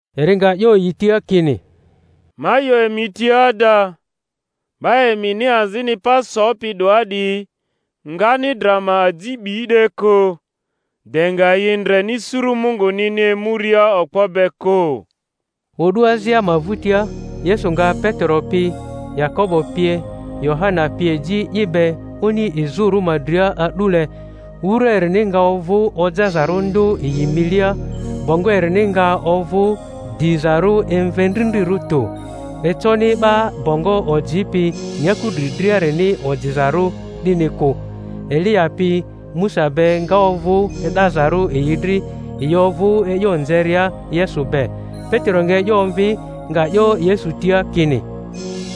Eri nga 'yo yi tia kini, Ma 'yo emi tia ada, 'ba emini azini pa sopi 'doa 'diyi, ngani dra ma aji 'bi 'de kᴜ, de nga yi ndreni suru Mungunini emuria okpo be kᴜ. O'du azia ma vᴜtia Yesu nga Petero pi Yakobo pie Yohana pie ji i be oni izᴜrᴜ ma dria a'dule; wura erini nga ovᴜ ojazarᴜ ndᴜ yi milia; bongo erini nga ovᴜ dizarᴜ emvendrindrirᴜ tᴜ, econi 'ba bongo ojipi nyaku dri driarini ojizarᴜ 'dini kᴜ. Eliya pi Musa be nga ovᴜ e'dazarᴜ yi dri; yi ovᴜ e'yo nzeria Yesu be. Petero nga e'yo omvi, nga 'yo Yesu tia kini,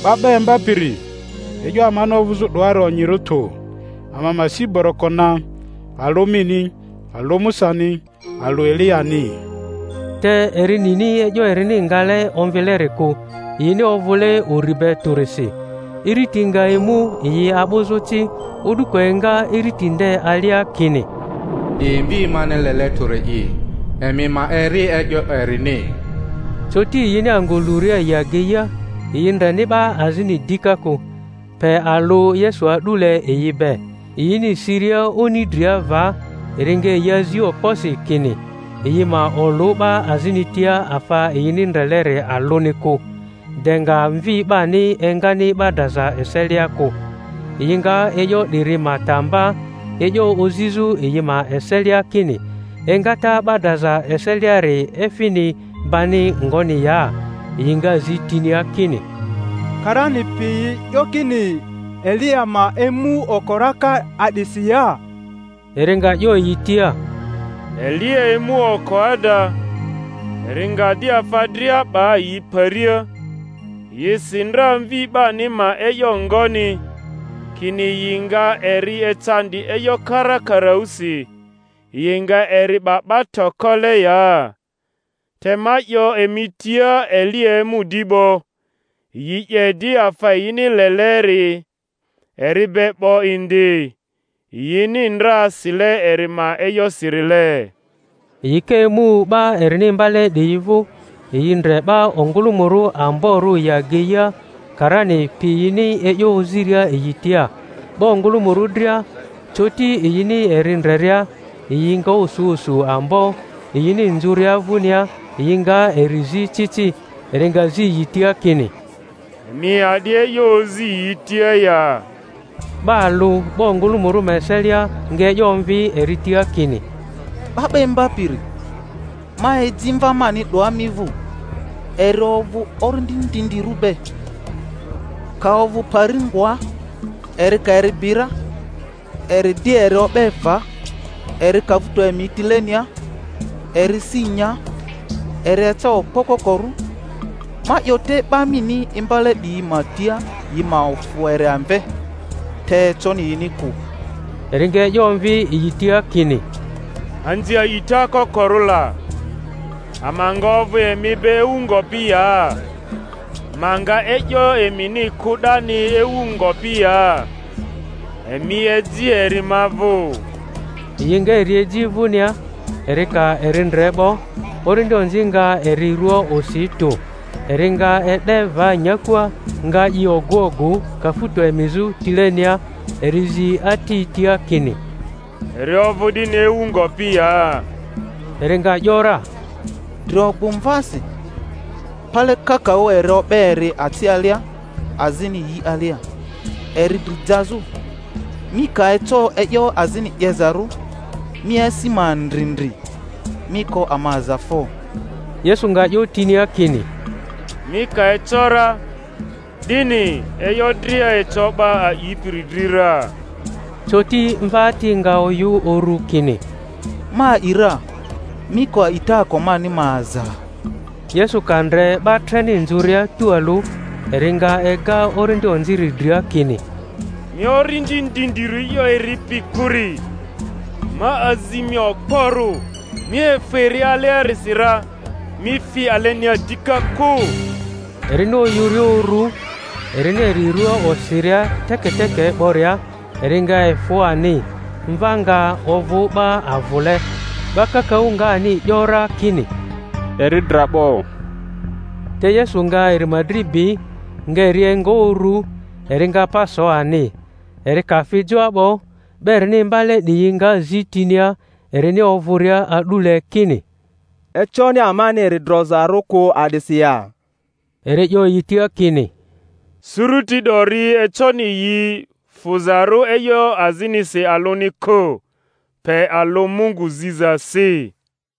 'Ba 'ba Imbapiri, e'yo amani ovᴜzᴜ 'doari onyirᴜ tᴜ; ama ma si boroko na, alᴜ mini, alᴜ Musani, alᴜ Eliyani. Te eri nini e'yo erini ngale omvileri kᴜ, yini ovᴜle ᴜri be tᴜrisi. Iriti nga emu yi a'bᴜzᴜ ci, o'duko enga iriti nde alia kini, 'Di Mvi mani lele tᴜri'i; emi ma eri e'yo erini. Coti yini angᴜ luria yi ageia, yi ndreni 'ba azini dika kᴜ, pe alᴜ Yesu a'dule yi be. Yini siria oni dria va, eri nga yi azi okposi, kini yi ma olᴜ 'ba azini tia afa yini ndreleri alᴜui kᴜ, de nga Mvi 'bani engani 'ba draza eselia kᴜ. Yi nga e'yo 'diri ma ta mba, e'yo ozizᴜ yi ma eselia kini engata 'ba draza eseliari, efini bani ngoni ya? Yi nga zi tinia kini, Karani piyi 'yo kini Eliya ma emu oko raka a'disi ya? Eri nga 'yo yi tia, Eliya emu oko ada, eri nga di afa dria 'ba yi paria; yi si ndra Mvi 'bani ma e'yo ngoni, kini yi nga eri ecandi e'yo karakaraᴜsi, yi nga eri 'ba 'ba tokole ya? Te ma 'yo emi tia Eliya emu di 'bo, yi 'ye di afa yini leleri eri be 'bo indi, yini ndra sile eri ma e'yosirile. Yi ka emu 'ba erini imbale 'diyi vᴜ, yi ndre 'ba ongᴜlᴜmᴜrᴜ amborᴜ yi ageia, karani piyini e'yo oziria yi tia. 'Ba ongᴜlᴜmᴜrᴜ dria, coti yini eri ndreria, yi nga osu osu ambo, yini nzᴜria vᴜnia yi nga eri zi ci ci. Eri nga zi yi tia kini, Emi a'di e'yo ozi yi tia ya? 'Ba alᴜ 'ba ongᴜlᴜmᴜrᴜ ma eselia nga e'yo omvi eri tia kini, 'Ba 'ba Imbapiri, ma eji mva mani 'doa mi vᴜ, eri ovᴜ orindi ndindirᴜ be; ka ovᴜ pari ngoa, eri ka eri bi ra, eri di eri o'be va; eri kafuto emi tilenia, eri si nya, eri eca okpo kokorᴜ; ma 'yo te 'ba mini imbale 'diyi ma tia yi ma ofᴜ eri amve, te econi yini kᴜ. Eri nga e'yo omvi yi tia kini, Anzi a'ita kokorᴜ la! ama nga ovᴜ emi be ewu ngopi ya? Ma nga e'yo emini kᴜ 'dani ewu ngopi ya? Emi eji eri ma vᴜ. Yi nga eri eji vᴜnia; eri ka eri ndre 'bo, orindi onzi nga eri rua osi tᴜ, eri nga e'de va nyakua, nga i ogᴜ ogᴜ kafuto emizᴜ tilenia. Eri zi ati tia kini, Eri ovᴜ 'dini ewu ngopi ya? Eri nga ‘yora, Drio, gbu mvasi. Pale kakaᴜ eri o'be eri aci alia, azini yi alia, eri dri jazᴜ; mi ka eco e'yo azini 'yezarᴜ, mi asi ma ndri ndri, mi ko ama aza fo! Yesu nga 'yo tinia kini, Mi ka eco ra, 'dini! E'yo dria eco 'ba a'ipiri dri ra. Coti mva ati nga oyᴜ uru, kini, Ma a'i ra; mi ko a'itaako mani ma aza! Yesu ka ndre 'ba treni nzᴜria tᴜalᴜ, eri nga ega orindi onziri dria, kini, Mi orindi ndindirᴜ e'yo eripi kᴜri, ma azi mi okporᴜ, mi efᴜ eri aliasi ra, mi fi alenia dika kᴜ. Erini oyᴜria uru, erini eri rua osiria teketeke 'boria, eri nga efᴜ ani, mva nga ovᴜ 'ba avᴜle; 'ba kakaᴜ nga ani 'yo ra kini, Eri dra 'bo. Te Yesu nga eri ma dri bi, nga eri enga uru, eri nga pa so ani. Eri ka fi joa 'bo, 'ba erini imbale 'diyi nga zi tinia erini ovᴜria a'dule, kini, Econi amani eri drozarᴜ kᴜ a'disi ya? Eri 'yo yi tia kini, Suruti 'dori, econi yini fᴜzarᴜ e'yo azinisi alᴜni kᴜ, pe alᴜ Mungu zizasi.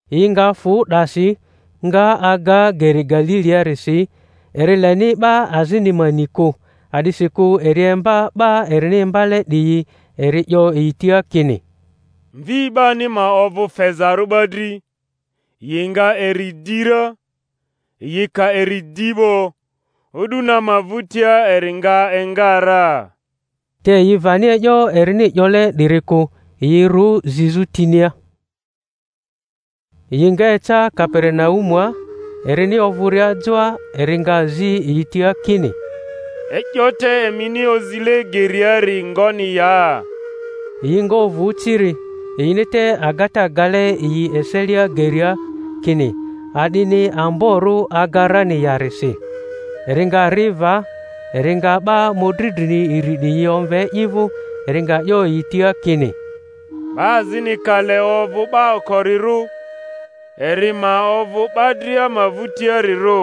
Yi nga fᴜ 'dasi, nga aga geri Galiliarisi. Eri leni 'ba azini ma ni kᴜ; a'disikᴜ eri imba 'ba erini imbale 'diyi, eri 'yo yi tia kini, Mvi 'bani ma ovᴜ fezarᴜ 'ba dri, yi nga eri 'di ra; yi ka eri 'di 'bo, o'du na ma vᴜtia eri nga enga ra. Te yi vani e'yo erini 'yole 'diri kᴜ, yi rᴜ zizᴜ tinia. Yi nga eca Kaperinaumua; erini ovᴜria joa eri nga zi yi tia kini, E'yo te emini ozile geriari ngoni ya? Yi nga ovᴜ ciri; yini te agata gale yi eselia geria, kini a'dini amborᴜ aga rani yarisi. Eri nga ri va, eri nga 'ba mᴜdri drini iri 'diyi omve i vᴜ; eri nga 'yo yi tia kini, 'Ba azini ka le ovᴜ 'ba okorirᴜ, eri ma ovᴜ 'ba dria ma vᴜtiarirᴜ,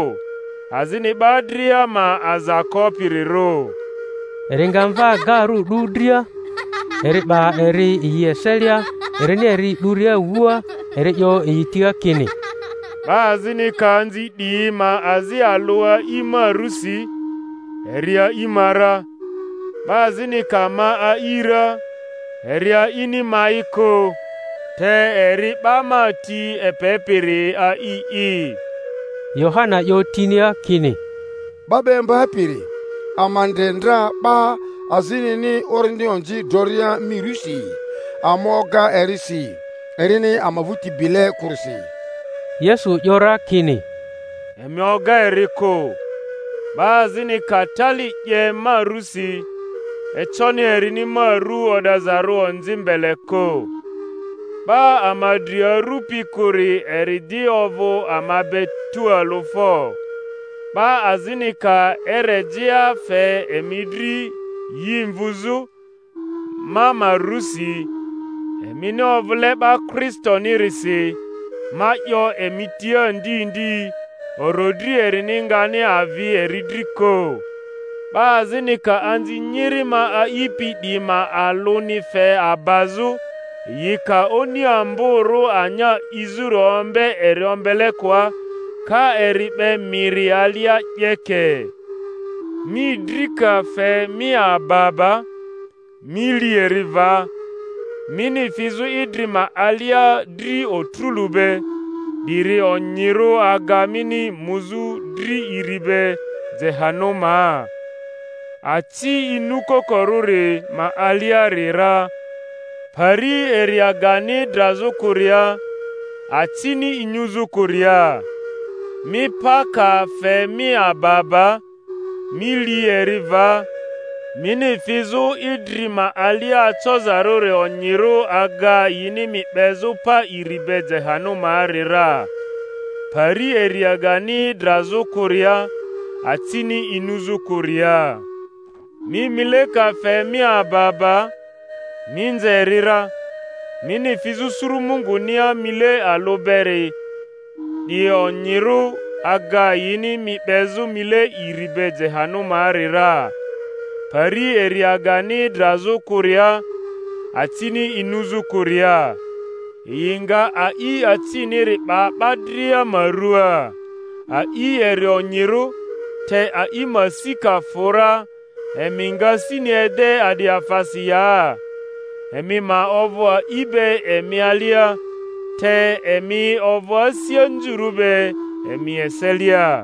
azini 'ba dria ma aza kopirirᴜ. Eri nga mva gaarᴜ 'du dria, eri 'ba eri yi eselia; erini eri 'duria wua, eri 'yo yi tia kini, 'Ba azini ka anzi 'diyi ma azi alᴜ a'i ma rusi, eri a'i ma ra; 'ba azini ka ma a'i ra, eri a'ini ma'i kᴜ, te eri 'ba ma ti epepiri a'i'i. Yohana 'yo tinia kini, 'Ba 'ba Imbapiri, ama ndre ndra 'ba azinini orindi onzi droria mi rusi; ama oga eri si, erini ama vᴜti bile kᴜrisi. Yesu 'yo ra kini, Emi oga eri kᴜ; 'ba azini ka tali 'ye ma rusi, econi erini ma ru o'dazarᴜ onzi mbele kᴜ. 'Ba ama dri arupi kᴜri eri di ovᴜ ama be tualᴜ fo! 'Ba azini ka erejea fe emi dri yi mvuzᴜ, ma ma rusi, emini ovᴜle 'ba Kristonirisi, ma 'yo emi tia ndi ndi, orodri erini ngani avi eri dri kᴜ. 'Ba azini ka anzi nyiri ma a'ipi 'diyi ma alᴜni fe abazᴜ, yi ka oni amborᴜ anya 'izᴜri ombe eri ombelekoa, ka eri 'be miri alia, 'yeke. Mi dri ka fe mi aba aba, mi li eri va; mini fizᴜ idri ma alia dri otrᴜlu be, 'diri onyirᴜ aga mini muzᴜ dri iri be jehanumaa, aci inyukokorᴜri ma aliari ra; pari eriagani drazᴜ kᴜria, acini inyuzᴜ kᴜria. Mi pa ka fe mi aba aba, mi li eri va; mini fizᴜ idri ma alia acozarᴜri onyirᴜ aga yini mi 'bezᴜ pa iri be jehanumaari ra; pari eriagani drazᴜ kᴜria, acini inyuzᴜ kᴜria. Mi mile ka fe mi aba aba, mi nze eri ra; mini fizᴜ suru Mungunia mile alᴜ beri, 'di onyirᴜ aga yini mi 'bezᴜ mile iri be jehanumaari ra; pari eriagani drazᴜ kᴜria, acini inyuzᴜ kᴜria. Yi nga a'i aciniri 'ba 'ba dria ma ruaa. A'i eri onyirᴜ; te a'i ma si ka fᴜ ra, emi nga sini ede a'di afasi ya? Emi ma ovᴜ a'i be emi alia, te emi ovᴜ asi anzurᴜ be emi eselia.